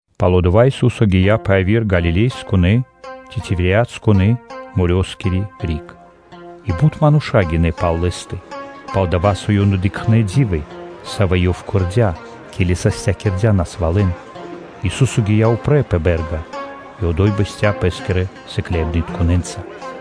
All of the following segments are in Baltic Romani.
Пало́ дава́ Ису́со гия́ пэ яви́р Галилеякирэ ци Тивериадаскирэ-морёскири риг. И бут мануша́ гинэ́ пал Лэ́стэ, пал-дова́ со ёнэ дыкхнэ́ ди́вы, савэ́ Ёв кэрдя́, ке́ли састякирдя насвалэн. Ису́со гия́ упрэ́ пэ бэ́рга и одо́й бэсця́ Пэ́скирэ сыкляибнытконэ́нца.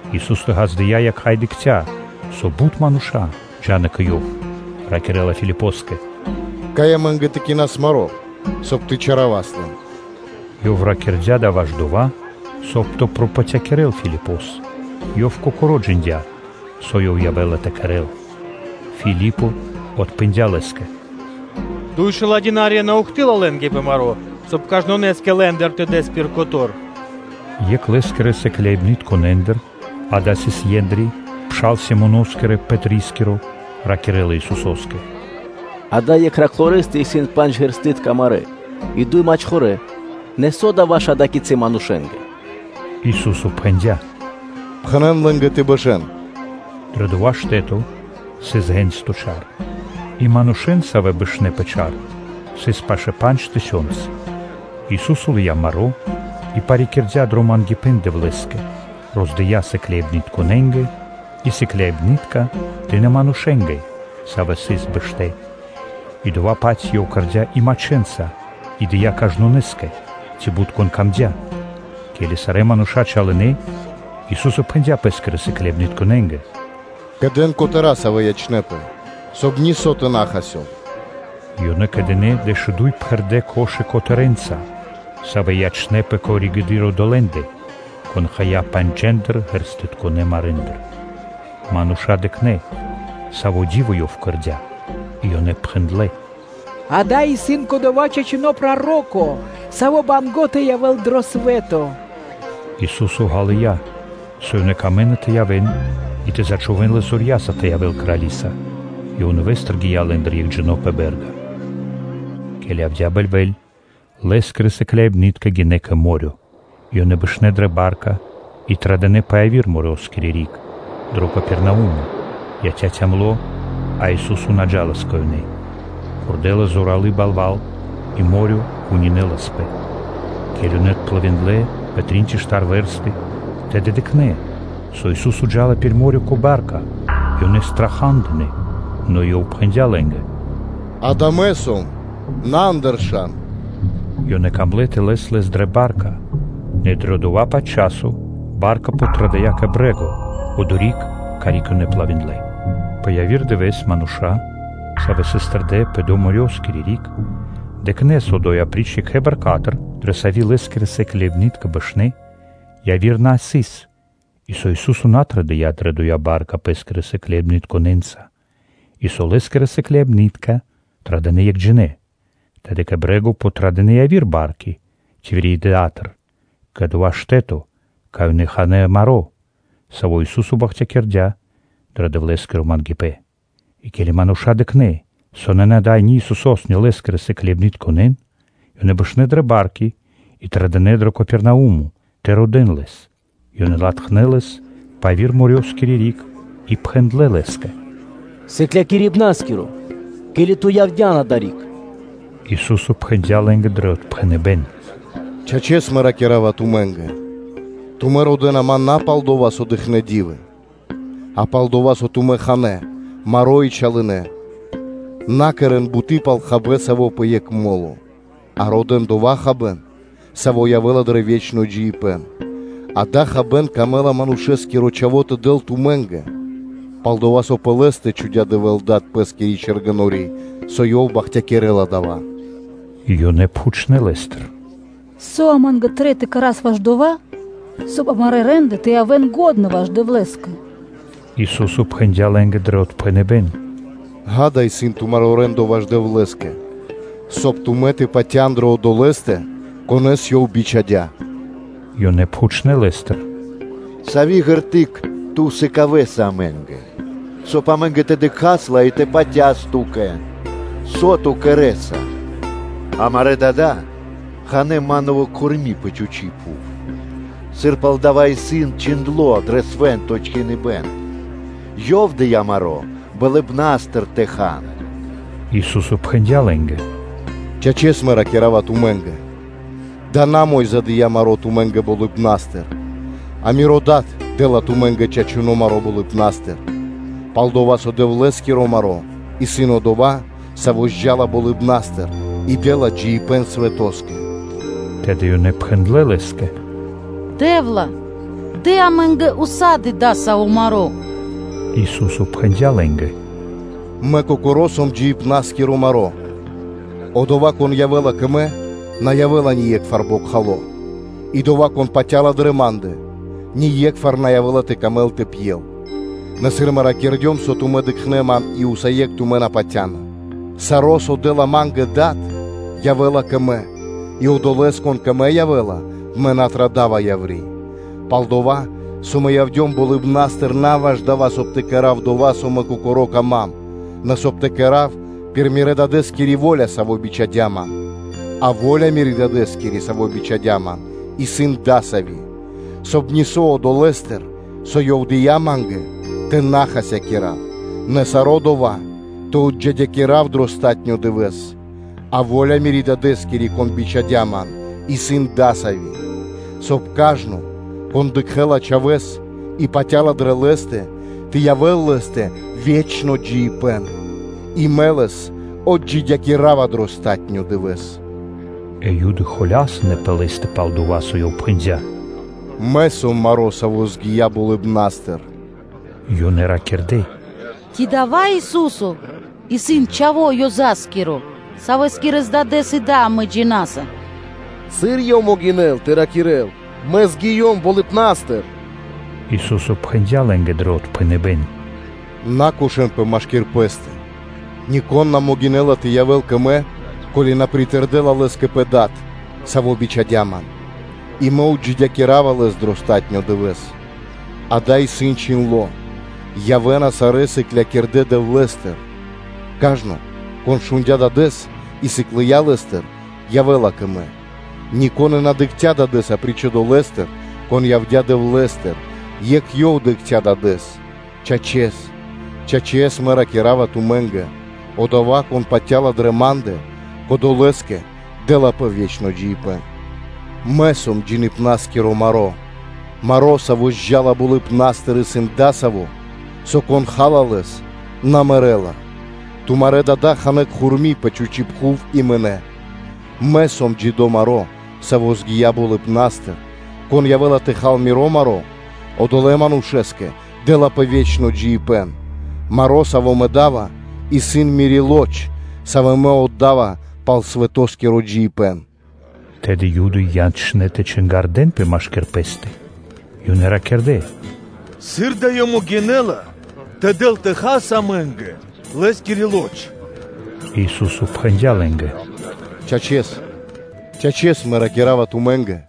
Ису́со ґаздыя́ якха́ и дыкхця́, со бут мануша́ джа́на кэ Ёв, ракирэ́ла Филипоскэ: “Кай амэ́нгэ тэ кинас маро́, соб (кай) тэ чалякирас лэн?” Ёв ракирдя́ дава́ ваш дова́, соб (кай) тэ пропатякирэл Филипос: Ёв кокоро́ джиндя́, со Ёв явэ́ла тэ кэрэ́л. Филипо отпхэндя́ Лэ́скэ: “Дуй шэла́ динарья на ухты́лла (на́доси) лэ́нгэ пэ маро́, соб (кай) кажнонэ́скэ лэ́ндыр тэ дас пир котэ́р (куско).” Екх Лэ́скирэ сыкляибнытконэндыр, ґа́да, сыс Ендри (Андреё), пшал Симоноскирэ Пэтрискиро, ракирэ́ла Исусо́скэ: “Ада́й екхэ раклорэстэ исын пандж ґэрстытка (ячменитка) марэ́ и дуй мачхорэ; нэ со дава́ ваш ада́кицы манушэ́нгэ?” Ису́со пхэндя́: “Пхэнэ́н лэ́нгэ тэ бэшэ́н.” Дрэ дова́ штэ́то сыс ґэнсто чар. И манушэ́н, савэ́ бэшнэ́ пэ чар, сыс пашэ́ пандж тысёнцы. Ису́со лыя́ маро́ и парикирдя дрэ мангипэ́н Дэвлэ́скэ, роздыя сыкляибнытконэ́нгэ и сыкляибны́тка дынэ́ манушэ́нгэ, савэ́ сыс бэштэ́, и дова́-паць Ёв кэрдя́ и мачхэнца и дыя́ кажнонэ́скэ, ци бут, кон камдя́. Ке́ли сарэ́ мануша́ чалынэ, Ису́со пхэндя́ Пэ́скирэ сыкляибнытконэ́нгэ: “Кэдэн котэра́ (куски), савэ́ ячнэ́пэ, соб (кай) нисо́ тэ на хасёл.” Ёнэ кэдынэ дэшуду́й пхэрдэ́ корзи́ны (кхудэ́) котэрэнца, савэ́ ячнэ́пэ пало́ (после) одолэ́ндэ, кон хая панджэндыр ґэрстытконэ марэндыр. Мануша́ дыкхнэ́, саво́ ди́во Ёв кэрдя́ и ёнэ пхэндлэ́: “Дава́ исын кодова́ чачуно́ Проро́ко, Савэ́скэ Трэй банго́ тэ явэ́л дро свэ́то.” Ису́со ґалыя́, со ёнэ камэ́на тэ явэ́н и тэ зачхувэн Лэс зорья́са тэ явэ́л крали́са; Ёв нэвэ́стыр гия́ лэ́ндыр екхджино́ пэ бэ́рга. Ке́ли явдя́ бэльвэ́ль, Лэ́скирэ сыкляибны́тка гинэ́ кэ мо́рё (дэрья́в). И ёнэ бэшнэ́ дрэ ба́рка, и традынэ пэ яви́р морёскири риг, дро Капернаумо. Яця́ кало́ (цёмно), а Ису́со на джа́лас кэ ёнэ. Пхурдэлас зоралы́ балва́л, и мо́рё (дэрья́в) кунинэласпэ. Ке́ли ёнэ отплывиндлэ (дынэ пли́ма дурэдыр) пэ трин ци штар вэрсты, тэды ёнэ дыкхнэ́, со Ису́со джа́лас пир мо́рё (дэрья́в) кэ ба́рка, и ёнэ страха́дынэ. Нэ Ёв пхэндя́ лэ́нгэ: “Ѓа́да, Мэ сом, на андыршан” Ёнэ камлэ́ тэ лэн Лэс дрэ ба́рка, нэ дрэ дова́-паць моменто ба́рка подтрадыя кэ брэ́го, одори́к, карик ёнэ плывиндлэ. Пэ яви́р дывэ́с мануша́, савэ́ сыс тэрдэ́ пэ доя́ морёскири риг, дыкхнэ́, со одо́й апри́ч екх ба́рка, дрэ сави́ Лэ́скирэ сыкляибны́тка бэшнэ́, яви́р на сыс, и со Ису́со на традыя́ дрэ доя́ ба́рка Лэ́скирэ сыкляибнытконэ́нца, и со Лэ́скирэ сыкляибны́тка традынэ екхджинэ. Тэды кэ брэ́го подтрадынэ и яви́р барки Тивериадатыр кэ дова́ штэ́то, кай ёнэ ханэ́ маро́, саво́ Ису́со бахтякирдя́ дро Дэвлэ́скиро мангипэ́н. И ке́ли мануша́ дыкхнэ́, со нанэ ада́й ни Исусо́с, ни Лэ́скирэ сыкляибнытконэ́н, ёнэ бэшнэ́ дрэ барки и традынэ дро Капернаумо тэ родэ́н Лэс. Ёнэ латхнэ́ Лэс пэ яви́р морёскири риг и пхэндлэ́ Лэ́скэ: “Сыклякирибна́скиро! Ке́ли Ту явдя́н адари́к?” Ису́со пхэндя́ лэ́нгэ дро отпхэныбэ́н: “Чачэс, Мэ ракира́ва тумэ́нгэ: тумэ́ родэ́на Ман на палдова́, со дыкхнэ́ ди́вы, а пал-дова́, со тумэ́ ханэ́ маро́ и чалынэ. На кэрэ́н буты́ пал хабэ́н, саво́ пэ екх мо́ло, а родэ́н дова́ хабэ́н, саво́ явэ́ла дрэ ве́чно джиибэ́н; дава́ хабэ́н камэ́ла Манушэ́скиро Чхаво́ тэ дэл тумэ́нгэ, – пал-дова́ со пэ Лэ́стэ чхудя́ Дэвэ́л Дад Пэ́скири чэргэнори́, со Ёв бахтякирэ́ла дава́.” Ёнэ пхучнэ́ Лэ́стыр: “Со амэ́нгэ трэй тэ кэра́с ваш дова́, соб (кай) амарэ́ рэ́нды (де́лы) тэ явэ́н лачхэ́ ваш Дэвлэ́скэ?” Ису́со пхэндя́ лэ́нгэ дро отпхэныбэ́н: “Ѓа́да, исын тумаро́ рэ́ндо ваш Дэвлэ́скэ, соб (кай) тумэ́ тэ патя́н дрэ Одолэ́стэ, Конэ́с Ёв бичхадя́.” Ёнэ пхучнэ́ Лэ́стыр: “Сави́ ґерты́к (знаме́ниё) Ту сыкавэса амэ́нгэ, соб (кай) амэ́нгэ тэ дыкхас ла и тэ патяс Ту́кэ? Со Ту кэрэ́са? Амарэ́ дада́ ханэ́ манново кхурми пэ чхучи́ пхув, сыр пал дава́ исын чхиндло́ дро Свэ́нто Чхиныбэ́н: ‘Ёв дыя́ маро́ болыбна́стыр тэ хан.’” Ису́со пхэндя́ лэ́нгэ: “Чачэс, Мэ ракира́ва тумэ́нгэ: дава́ исын на Мо́йза (Моисеё) дыя́ маро́ тумэ́нгэ Болыбна́стыр, а Миро Дад дэ́ла тумэ́нгэ чачуно́ маро́ болыбна́стыр. Пал-дова́ со Дэвлэ́скиро маро́ исын Одова́, Саво́ явэ́ла (джа́ла тэлэ́) болыбна́стыр и дэ́ла джиибэ́н свэтоскэ.” Тэды ёнэ пхэндлэ́ Лэ́скэ: “Раё Дэ́вла! Дэ амэ́нгэ ўса́ды (сак) дава́ маро́.” Ису́со пхэндя́ лэ́нгэ: “Мэ кокоро́ сом джиибна́скиро маро́; одова́, кон явэ́ла кэ Мэ, на явэ́ла ние́кхвар бокхало, и одова́, кон патя́ла дрэ Ма́ндэ, ние́кхвар на явэ́ла тэ камэл тэ пьел. Нэ сыр Мэ ракирдём, со тумэ́ дыкхнэ́ Ман, и усае́кх тумэ́ на патя́на. Саро́, со дэ́ла Ма́нгэ Дад, явэ́ла кэ Мэ, и одолэ́с, кон кэ Мэ явэ́ла, Мэ на традава яври́. Пал-дова́ со Мэ явдём болыбна́стыр на ваш дава́, соб (кай) тэ кэра́в дова́, со Мэ кокоро́ кама́м, нэ, соб (кай) тэ кэра́в пир Мирэ́-Дадэ́скири во́ля, Саво́ бичхадя́ Ман. А во́ля Мирэ́ Дадэ́скири, Саво́ бичхадя́ Ман, исын дасави́, соб (кай) нисо́ одолэ́стыр, со Ёв дыя́ Ма́нгэ тэ на хасякира́в, нэ саро́ дова́ тэ отджидякирав дро палатуно́ (последнё) дывэ́с. А во́ля Мирэ́ Дадэ́скири, Кон бичхадя́ Ман, исын дасави́, соб (кай) кажно, кон дыкхэ́ла Чхавэ́с и патя́ла дрэ Лэ́стэ, тэ явэ́л лэ́стэ ве́чно джиибэ́н; и Мэ лэс отджидякирава дро палатуно́ (последнё) дывэ́с.” Э Юды ракирдэ́ холямэс пэ Лэ́стэ пал дова́, со Ёв пхэндя́: “Мэ сом маро́, саво́ явдя́ болыбна́стыр.” Ёнэ ракирдэ́: “Ци дава́ Ису́со исын чхаво́ Ёзаскиро (Иосифоскиро), Савэскирэс Дадэ́с и Да амэ джина́са? Сыр Ёв могинэ́ла тэ ракирэ́л: “Мэ явдем болыбна́стыр?” Ису́со пхэндя́ лэ́нгэ дро отпхэныбэ́н: “На ракирэ́н холямэс машки́р пэ́стэ. Нико́н на могинэ́ла тэ явэ́л кэ Мэ, ко́ли на притэрдэла лэс кэ Пэ Дад, Саво́ бичхадя́ Ман; и Мэ отджидякирава лэс дро палатуно́ дывэ́с. Акэ, исын чхиндло́: ‘Явэ́на сарэ́ сыклякирдэ́ Дэвлэ́стыр’. Кажно, кон шундя́ Дадэ́с и сыклыя Лэ́стыр, явэ́ла кэ Мэ; нико́н и на дыкхця́ Дадэ́с, апри́ч Одолэ́стэ, Кон явдя́ Дэвлэ́стыр, екх Ёв дыкхця́ Дадэ́с. Чачэс, чачэс Мэ ракира́ва тумэ́нгэ: одова́, кон патя́ла дрэ Ма́ндэ, кодолэ́скэ дэ́лапэ ве́чно джиибэ́н’. Мэ сом джиибна́скиро маро́. Маро, саво́ явэ́ла болыбна́стыр, исын дасаво, со кон ха́ла лэс, одова́ на мэрэ́ла. Тумарэ́ дада́ ханэ́ кхурми пэ чхучи́ пхув и мынэ́. Мэ сом джидо́ маро́, саво́ явдя́ болыбна́стыр; кон явэ́ла тэ хал Миро маро́, одолэ́ манушэ́скэ дэ́лапэ ве́чно джиибэ́н; маро́, саво́ Мэ да́ва, исын Мири́ лоч (маса́), савэ́ Мэ отда́ва, соб (кай) свэ́то тэ дживэ́л.” Тэды Юды ячнэ́ тэ чингардэнпэ машки́р пэ́стэ, и ёнэ ракирдэ́: “Сыр да Ёв могинэ́ла тэ дэл тэ хас амэ́нгэ Лэ́скири лоч (плоть)?” Ису́со пхэндя́ лэ́нгэ: “Чачэс, чачэс Мэ ракира́ва тумэ́нгэ: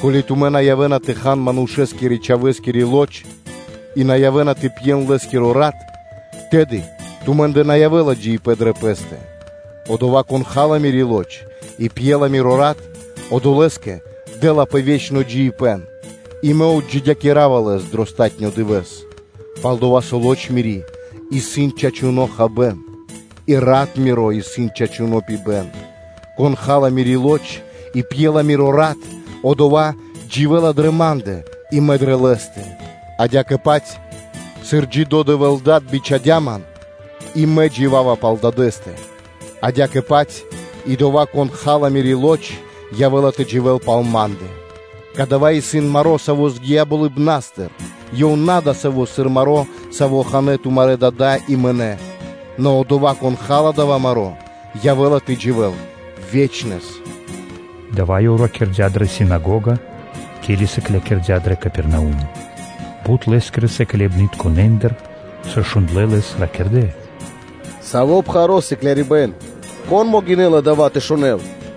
ко́ли тумэ́ на явэ́на тэ хан Манушэ́скирэ-Чхавэскири лоч и на явэ́на тэ пьен Лэ́скиро рат, тэды тумэ́ндэ на явэ́ла джиибэ́н дрэ пэ́стэ. Одова́, кон ха́ла Мири́ Лоч и пьела Миро Рат, одолэ́скэ дэ́лапэ ве́чно джиибэ́н, и Мэ отджидякирава лэс дро палатуно́ дывэ́с; пал-дова́ со Лоч Мири́ исын чачуно́ хабэ́н, и Рат Миро исын чачуно́ пибэ́н; кон ха́ла Мири́ Лоч и пьела Миро Рат, одова́ дживэ́ла дрэ Ма́ндэ, и Мэ ячавапэ дрэ лэ́стэ. Адя́кэ-паць, сыр Джидо́ Дэвэ́л Дад бичхадя́ Ман, и Мэ джива́ва пал Дадэ́стэ, адя́кэ-паць и одова́, кон ха́ла Мири́ лоч, явэ́ла тэ дживэ́л пал Ма́ндэ. Кадава́ исын маро́, саво́ явдя́ болыбна́стыр, ёв исын на дасаво, сыр маро́, саво́ ханэ́ тумарэ́ дада́ и мынэ́: нэ одова́, кон ха́ла дава́ маро́, явэ́ла тэ дживэ́л ве́чнэс.” Дава́ Ёв ракирдя́ дрэ синагога, ке́ли сыклякирдя́ дро Капернаумо. Бут Лэ́скирэ сыкляибнытконэндыр, сыр шундлэ́ Лэс, ракирдэ́: “Саво́ пхаро́ исын сыклякирибэ́н! Кон могинэ́ла дава́ тэ шунэ́л?”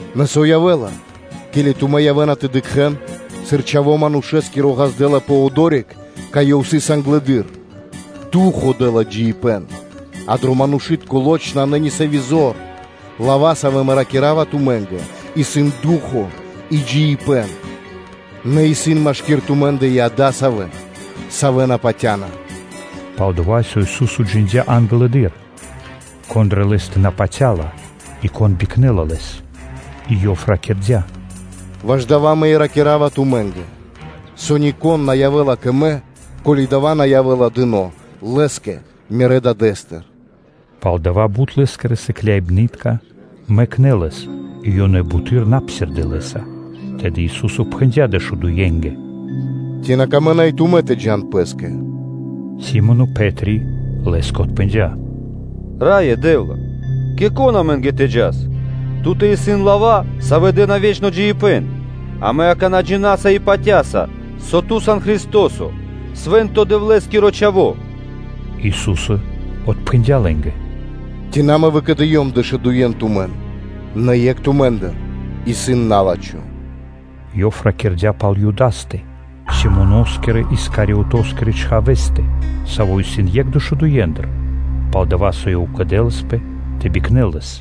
Нэ со явэ́ла, ке́ли тумэ́ явэ́на тэ дыкхэ́н, сыр Чхаво́ Манушэ́скиро ґаздэ́лапэ одори́к, кай Ёв сыс англэды́р? Ду́хо (Фа́но) дэ́ла джиибэ́н, а дро манушы́тко лоч (плоть) нанэ ни сави́ зор. Лава́, савэ́ Мэ ракира́ва тумэ́нгэ, исын ду́хо (фа́но) и джиибэ́н. Нэ исын машки́р тумэ́ндэ и адасавэ́, савэ́ на патя́на.” Пал-дова́ со Ису́со джиндя́ англэды́р, кон дрэ Лэ́стэ на патя́ла и кон бикнэла Лэс. И Ёв ракирдя́: “Ваш дава́ и Мэ ракира́ва тумэ́нгэ, со нико́н на явэ́ла кэ Мэ, ко́ли дава́ на явэ́ла дыно́ лэ́скэ Мирэ́ Дадэ́стыр.” Пал дава́ бут Лэ́скирэ сыкляибны́тка мэкнэ́ Лэс и ёнэ буты́р на псирдэ́ Лэ́са. Тэды Ису́со пхэндя́ дэшудуенгэ: “Ци на камэ́на и тумэ́ тэ джа́н пэ́скэ?” Си́моно Пэ́три Лэ́скэ отпхэндя́: “Раё Дэ́вла! Кэ кон амэ́нгэ тэ джас? Ту́тэ исын лава́, савэ́ дэ́на ве́чно джиибэ́н. Амэ акана́ джина́са и патя́са, со Ту сан Христо́со, Свэ́нто Дэвлэ́скиро Чхаво́.” Ису́со отпхэндя́ лэ́нгэ: “Ци на Мэ выкэдыём дэшудуен тумэн, нэ екх тумэ́ндыр исын на́лачхо.” Ёв ракирдя́ пал Юдастэ, Симоноскирэ-Искариотоскирэ чхавэ́стэ, саво́ сыс екх дэшудуендыр, пал-дова́, со ёв кэдэласпэ тэ бикнэл Лэс.